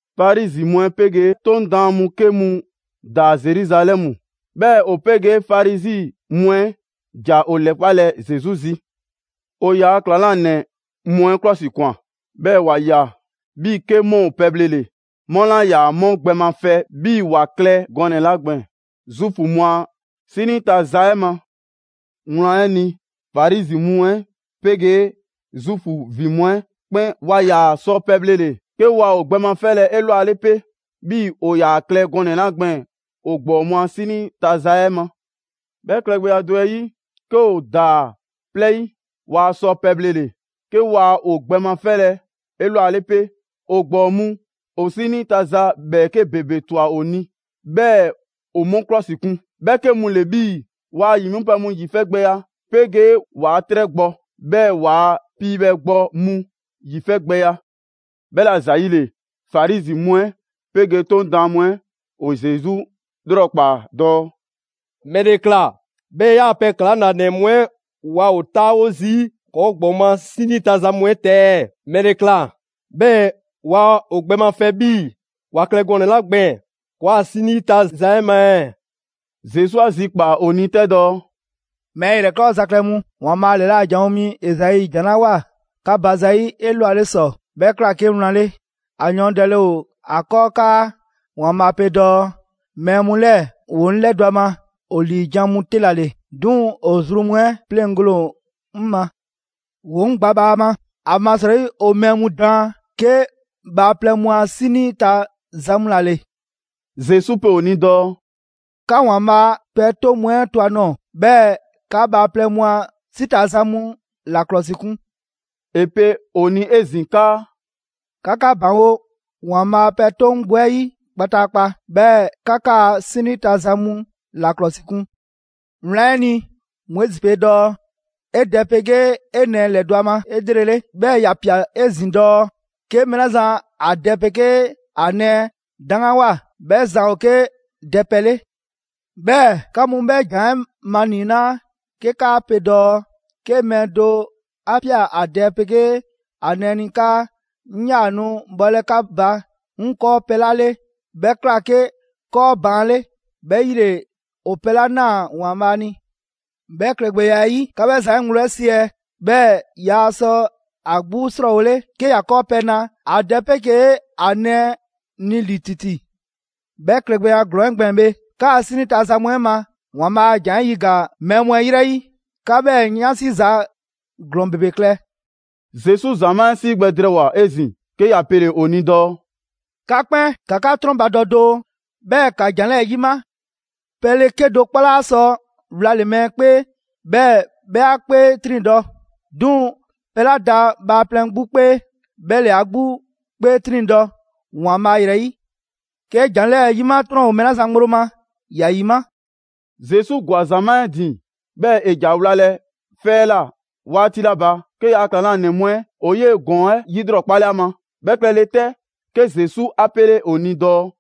Farizi mu 'ɛ 'pegee 'Toŋ daan mu 'ke mu ‑daa Zeruzalɛmu. 'Bhɛɛ‑ ‑o 'pegee Farizi mu 'ɛ ‑ja ‑o ‑lɛkpalɛ Zesu zi. ‑O ‑yaa' ‑klaŋlanɛ mu 'ɛ 'klɔsikwan, 'bhɛɛ‑ ‑wa ꞊ya 'bhii‑ 'ke 'mu ‑o pɛbhlele, 'mu 'laa ‑yaa 'mu gbɛ mafɛ 'bhii‑ ‑wa klɛ gɔnɛ‑ 'la gbɛɛn‑ Zuufu mu a 'sinii ta za 'ɛ ma. Wlan 'ɛ ni, Farizi mu 'ɛ 'pegee Zuufu ‑vin mu 'ɛ 'kpɛn waa ‑yaa sɔ pɛbhlele, 'ke ‑waa ‑o gbɛ mafɛlɛ 'elwale 'pe, 'bhii‑ ‑o ‑yaa klɛ gɔnɛ‑ 'la gbɛɛn‑ ‑o ‑gbɔɔ mu a 'sinii ta za 'ɛ ma. 'Bhɛ klɛgbɛya do 'ɛ 'yi, 'ke ‑o ‑daa 'plɛɛ 'yi, waa sɔ pɛbhlele, 'ke waa ‑o gbɛ mafɛlɛ 'elwale pe. ‑O ‑gbɔɔ mu ‑o 'sinii ta za ‑bhɛɛke' ‑bebe ꞊twa ‑o ni, 'bhɛɛ‑ ‑o 'mu 'klɔsikun: 'bhɛ 'ke mu ‑le 'bhii‑ ‑waa' ‑yi 'mipɛ‑ mu ‑yifɛgbɛya 'pegee ‑waa' 'trɛgbɔ‑, 'bhɛɛ‑ ‑waa' piibhɛgbɔ mu ‑yifɛgbɛya. 'Bhɛla ‑zayi' ‑le, Farizi mu 'ɛ 'pegee 'Toŋ Daan mu 'ɛ ‑o Zesu 'lrɔkpaa‑ dɔɔ: «‑Mɛle ꞊kla 'bhɛɛ‑ ‑yaa' pɛ ‑klaŋlanɛ mu 'ɛ waa ‑o 'taawo zii' ‑kɔɔ' ‑gbɔɔ mu a 'sinii ta za mu 'ɛ ta ɛɛ? ‑Mɛle ꞊kla 'bhɛɛ‑ waa ‑o gbɛ mafɛ 'bhii‑ ‑wa klɛ gɔnɛ‑ 'la gbɛɛn‑ ‑kɔɔa' 'sinii ta za 'ɛ ma ɛɛ?» Zesu 'a zikpaa‑ ‑o ni 'tɛ dɔɔ: «Mɛɛ ‑yrɛkɔɔza klɛ mu, ‑Waanbhaa' ‑lɛla' janwo mi Ezai ‑jan 'la ꞊woa 'ka ba zayi' 'elwale ‑sɔ, 'bhɛ ꞊kla 'ke wlan 'le. ‑A yɔɔndɛle ‑o ‑a 'kɔɔ 'kaa ‑Waanbhaa' pe dɔɔ: ‹Mɛɛ mu 'lɛɛ‑ ‑woo 'ŋ 'lɛdɔ‑ ‑a ma ‑o ‑liijan' mu 'te ‑la ‑le; 'duŋ‑ ‑o zru mu 'ɛ 'pleŋgole ‑o 'ŋ ma. ‑Woo 'ŋ gba bhaama, ‑amasrɔyi ‑o mɛɛ mu daan 'ke bhaaplɛŋ mu a 'sinii ta za mu ‑la ‑le.›» Zesu pe ‑o ni dɔɔ: «'Ka ‑Waanbhaa' a pɛ 'toŋ mu 'ɛ to ‑a nɔɔ‑, 'bhɛɛ‑ 'ka bhaaplɛŋ mu a 'si ta za mu ‑la ‑klɔsikun.» ‑E pe ‑o ni 'ezin‑ 'kaa: «'Ka 'ka ‑baŋgo' ‑Waanbhaa' pɛ 'toŋ 'gbu 'ɛ 'yi kpataakpa, 'bhɛɛ‑ 'ka 'kaa‑ 'sinii ta za mu ‑la 'klɔsikun. Wlan 'ɛ ni, Moizi pe dɔɔ: ‹'E dɛ 'pegee 'e nɛɛ ‑lɛdɔ' ‑o ma 'elrele›. 'Bhɛɛ‑ ‑ya ꞊pia 'ezin‑ dɔɔ: ‹'Ke mɛɛ 'la zan ‑a dɛ 'pegee ‑a nɛɛ 'daŋganwoa, 'bhɛ zan ‑o 'ke dɛpɛ 'le›. 'Bhɛɛ‑ 'ka mu 'bhɛ ‑jan 'ɛ maniinaa 'ke 'kaa pe dɔɔ 'ke mɛɛ do 'a ꞊pia ‑a dɛ 'pegee ‑a nɛɛ ni 'kaa ‹'Ŋ 'yaa‑ nu bhɔlɛ 'ka ba 'ŋ 'kɔɔpɛ‑ 'la 'le, 'bhɛ ꞊kla 'ke 'kɔɔban 'le ('bhɛ 'yi ‑le ‑o pɛ 'la ꞊naa ‑Waanbhaa' ni)›. 'Bhɛ klɛgbɛya 'ɛ 'yi, 'ka 'bhɛ zan 'ɛ ŋgblo 'ɛ siɛ, 'bhɛɛ‑ yaa sɔ ‑a 'gbu 'srɔɔwole 'ke ‑ya 'kɔɔpɛ‑ na ‑a dɛ 'pegee ‑a nɛɛ ni ‑li ‑titi. 'Bhɛ klɛgbɛya ‑glɔɔn 'ɛ gbɛɛn‑ bhe, 'kaa‑ 'sinii ta za mu 'ɛ ma, ‑Waanbhaa' a ‑jan 'ɛ 'yiga‑ mɛɛ mu 'ɛ ‑yrɛ 'yi. 'Ka 'bhɛɛ‑ 'yansi za ‑glɔɔn ‑bebe klɛ!» Zesu ‑zamaa' 'ɛ 'sii gbɛ drɛɛwoa‑ 'ezin‑, 'ke ‑ya pele‑ ‑o ni dɔɔ: «'Ka 'kpɛn, ‑ka 'ka 'trɔnbadɔ doo, 'bhɛɛ‑ ‑ka ‑jan 'lɛɛ‑ 'yima! Pɛle 'kedo‑ 'kpɔ 'laa sɔ wlale‑ mɛɛ 'kpee, 'bhɛɛ‑ 'bhɛ 'a 'kpee 'triŋdɔ‑. 'Duŋ‑ pɛ 'la da bhaaplɛŋ 'gbu 'kpee, 'bhɛ ‑le ‑a 'gbu 'kpee 'triŋdɔ‑ ‑Waanbhaa' ‑yrɛ 'yi. ['Ke ‑jan 'lɛɛ‑ ‑yima' 'trɔn ‑o mɛɛ 'la zan ŋgblo ma, ‑ya ‑yima'.]» Zesu ‑gwa ‑zamaa' 'ɛ ‑din, 'bhɛɛ‑ ‑e ‑ja wlalɛ 'fɛ 'ɛ ꞊la 'waati 'la ba, 'ke ‑yaa' ‑klaŋlanɛ mu 'ɛ ‑o 'yee‑ ‑gɔɔn 'ɛ 'yilrɔkpale 'a ma. 'Bhɛ klɛle 'tɛ, 'ke Zesu 'a 'pele ‑o ni dɔɔ: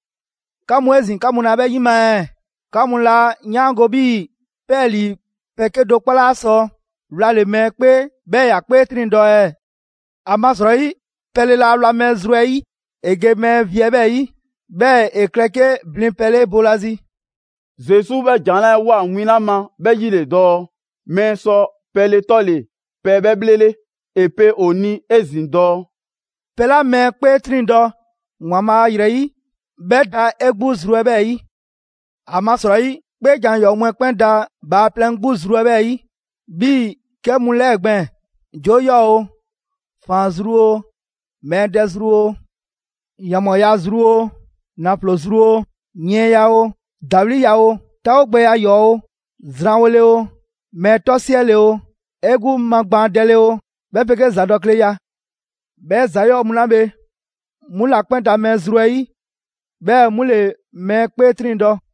«'Ka mu 'ezin‑, 'ka mu laa 'bhɛ 'yima‑ ɛɛ? 'Ka mu 'laa 'yaango‑ 'bhii‑ 'pɛɛlii‑ pɛ 'kedo‑ 'kpɔ 'laa sɔ wlale‑ mɛɛ 'kpee 'bhɛɛ‑ ‑ya 'kpee 'triŋdɔ‑ ɛɛ? ‑Amasrɔyi, pɛle laa wla mɛɛ zru 'ɛ 'yi, ‑e ge mɛɛ vi 'ɛ 'bhɛɛ‑ 'yi; 'bhɛɛ‑ ‑e klɛ 'ke blinpɛ 'le boolazi.» (Zesu 'bhɛ ‑jan 'lɛɛ‑ 'woa‑ win 'la ma 'bhɛ 'yi ‑le dɔɔ: Mɛɛ sɔ pɛle 'tɔle‑ pɛ 'bhɛ 'bhlele.) ‑E pe ‑o ni 'ezin‑ dɔɔ: «Pɛ 'la mɛɛ 'kpee 'triŋdɔ‑ ‑Waanbhaa' ‑yrɛ 'yi, 'bhɛ da 'e 'gbu zru 'ɛ 'bhɛɛ‑ 'yi. ‑Amasrɔyi, 'kpeejan‑ ‑yɔɔ' mu 'ɛ 'kpɛn da bhaaplɛŋ 'gbu zru 'ɛ 'bhɛɛ‑ 'yi 'bhii‑ 'kɛ mu 'lɛɛ gbɛɛn‑: 'joo 'yɔɔ‑ oo, ‑faan zru oo, mɛɛ dɛ zru oo, ‑yanbhɔɔya zru oo, ‑naflo zru oo, yiɛnya oo, ‑dawliya oo, 'taawogbɛya ‑yɔɔ' oo, zranwole oo, mɛɛ 'tɔsiɛle oo, 'e 'gbu magbaandɛle oo, 'bhɛ 'pegee ‑zadɔkleya. 'Bhɛ ‑za 'yɔɔ‑ mu 'la bhe, 'mu ‑la 'kpɛn da mɛɛ zru 'ɛ 'yi, 'bhɛɛ‑ 'mu ‑le mɛɛ 'kpee 'triŋdɔ‑.»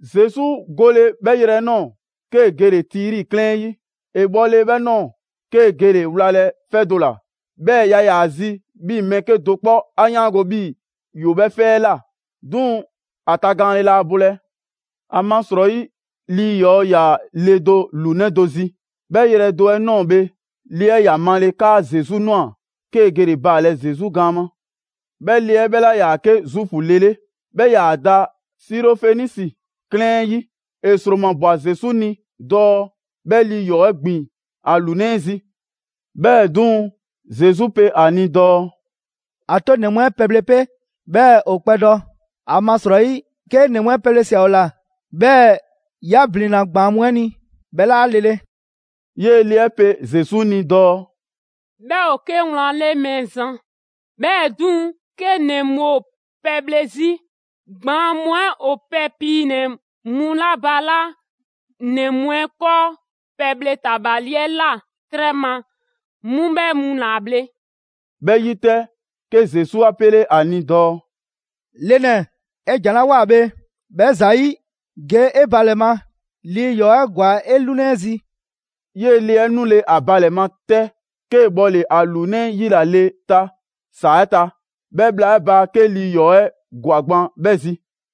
Zesu gole 'bhɛ yrɛ 'ɛ ꞊nɔɔ, 'kee‑ gele Tiri 'klɛɛn 'ɛ 'yi. ‑E bhɔle 'bhɛ ꞊nɔɔ, 'kee‑ gele‑ wlalɛ 'fɛ do ‑la; 'bhɛɛ‑ yaa ‑yaa zi 'bhii‑ mɛɛ 'kedo‑ 'kpɔ 'a 'yaango‑ 'bhii‑ ‑yoo 'bhɛ 'fɛ 'ɛ ꞊la; 'duŋ‑ ‑a tagaanle laa bolɛ. ‑Amasrɔyi, lii 'yɔɔ‑ ‑yaa le do ‑lunɛ' do zi. 'Bhɛ yrɛ do 'ɛ ꞊nɔɔ bhe, le 'ɛ ‑ya 'male‑ 'kaa Zesu ꞊nwa, 'kee‑ gele‑ baalɛ Zesu gaan ma. 'Bhɛ le 'ɛ 'bhɛ 'laa ‑yaa 'ke Zuufu le 'le, 'bhɛ ‑yaa da Sirofenisi 'klɛɛn 'ɛ 'yi. ‑E ‑sromabwa Zesu ni dɔɔ 'bhɛ lii 'yɔɔ‑ 'ɛ ‑gbin ‑a ‑lunɛ' 'ɛ zi. 'Bhɛɛ‑ 'duŋ‑, Zesu pe ‑a ni dɔɔ: «‑A 'to ‑nɛ mu 'ɛ pɛbhle 'pe 'bhɛɛ‑ ‑o kpɛdɔ. ‑Amasrɔyi, 'kee ‑nɛ mu a pɛbhle ꞊sia ‑o ‑la, 'bhɛɛ‑ 'ya ‑blinna ‑gbaan' mu 'ɛ ni, 'bhɛ 'laa lele.» 'Yee‑ le 'ɛ pe Zesu ni dɔɔ: «'Bhɛ ‑o 'ke wlan 'le Mɛɛzan, 'bhɛɛ‑ 'duŋ‑, 'ke ‑nɛ mu ‑o pɛbhle 'zi, ‑gbaan' mu 'ɛ ‑o pɛ piinɛ‑ mu 'la balaa' ‑nɛ mu 'ɛ 'kɔɔ pɛbhle ‑tabali 'ɛ ꞊la 'trɛ ma, 'mu 'bhɛ mu ‑la bhle.» 'Bhɛ 'yi 'tɛ, 'ke Zesu 'a 'pele ‑a ni dɔɔ: «Le ‑nɛ, 'e ‑jan 'la ꞊woa bhe, 'bhɛ ‑zayi', ge 'e ba ‑lɛ ma; lii ‑yɔɔ' 'ɛ ‑gwa 'e 'lunɛ 'ɛ zi.» 'Yee‑ le 'ɛ 'nule‑ ‑a ba ‑lɛ ma 'tɛ, 'kee‑ bhɔle‑ ‑a ‑lunɛ' 'ɛ 'yila‑ le ta ‑saa 'ɛ ta. 'Bhɛ bhla 'ɛ ba 'ke lii 'yɔɔ‑ 'ɛ ‑gwa gban 'bhɛ zi.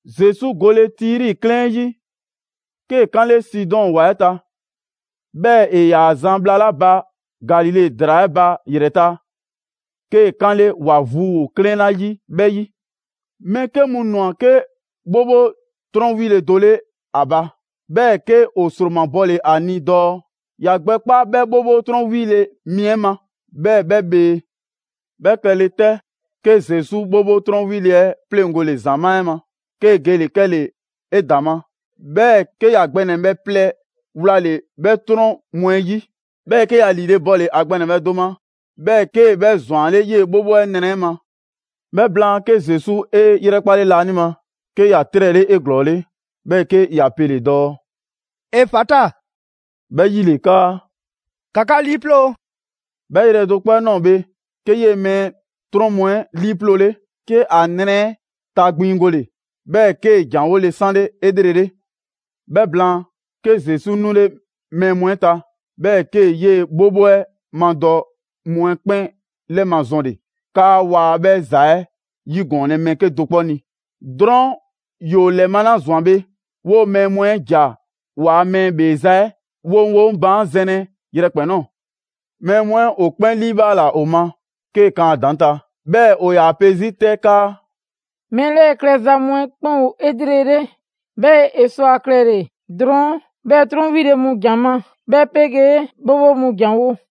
Zesu gole Tiri 'klɛɛn 'ɛ 'yi, 'kee‑ 'kanle Sidɔn ‑wa 'ɛ ta, 'bhɛɛ‑ ‑e ‑yaa zan bhla 'la ba Galile ‑draa 'ɛ ba ‑yrɛ ta, 'kee 'kanle ‑wa vu ‑o 'klɛɛn 'la 'yi 'bhɛ 'yi. Mɛɛ 'ke mu ‑nwa 'ke 'bhobho 'trɔn 'wile do 'le ‑a ba. 'Bhɛɛ‑ 'ke ‑o ‑sromabɔle ‑a ni dɔɔ ‑ya gbɛ 'kpa 'bhɛ 'bhobho 'trɔn 'wile‑ mi 'ɛ ma, 'bhɛɛ‑ 'bhɛ bhee. 'Bhɛ klɛle 'tɛ, 'ke Zesu 'bhobho 'trɔn 'wile‑ 'ɛ pleŋgole ‑zamaa' 'ɛ ma, 'kee‑ gele‑ 'kɛle‑ 'edaŋma. 'Bhɛɛ‑ 'ke ‑ya gbɛ ‑nɛbhɛ' plɛ wlale‑ 'bhɛ 'trɔn mu 'ɛ 'yi. 'Bhɛɛ, 'ke ‑ya ‑liile' bɔle‑ ‑a gbɛ ‑nɛbhɛ' do ma, 'bhɛɛ‑ 'kee‑ 'bhɛ ‑zwanle' 'yee‑ 'bhobho 'ɛ nrɛ 'ɛ ma. 'Bhɛ blaan, 'ke Zesu 'e 'yrɛkpale laanima, 'ke ‑ya 'trɛle 'eglɔɔle, 'bhɛɛ‑ 'ke ‑ya pele‑ dɔɔ: «Efata!» 'Bhɛ 'yile 'kaa: «‑Ka 'ka 'liiploo‑!» 'Bhɛ yrɛ do 'kpɔ 'ɛ ꞊nɔɔ bhe, 'ke 'yee‑ mɛɛ 'ɛ 'trɔn mu 'ɛ 'liiploole, 'ke ‑a nrɛ 'ɛ tagbiŋgole, 'bhɛɛ‑ 'kee‑ ‑jan 'wole 'sanle 'elrele. 'Bhɛ blaan, 'ke Zesu 'nule mɛɛ mu 'ɛ ta, 'bhɛɛ‑ 'kee‑ 'yee‑ 'bhobho 'ɛ 'madɔ‑ mu 'ɛ 'kpɛn 'lɛmazɔnle 'kaa waa 'bhɛ ‑za 'ɛ 'yigɔɔnlɛ mɛɛ 'kedo‑ 'kpɔ ni. Drɔɔn' ‑yoo ‑lɛmalazwan bhe, 'woo‑ mɛɛ mu 'ɛ ‑ja ‑waa' mɛɛ 'ɛ 'bheeza‑ 'ɛ woŋwoŋ baan' zɛnlɛ yrɛkpɛn‑ ꞊nɔɔ. Mɛɛ mu 'ɛ ‑o 'kpɛn 'liibhaala ‑o ma 'kee kan a ‑daŋ' ta. 'Bhɛɛ‑ ‑o ‑yaa pe 'zi 'tɛ 'kaa: «Mɛɛ 'lɛɛ‑ klɛza mu 'ɛ 'kpɛn ‑o 'elrele. 'Bhɛɛ‑ ‑e sɔ ‑a klɛle‑ drɔɔn' 'bhɛɛ‑ 'trɔn 'wile‑ mu ‑jan ma, 'bhɛ 'pegee 'bhobho mu ‑janwo'.»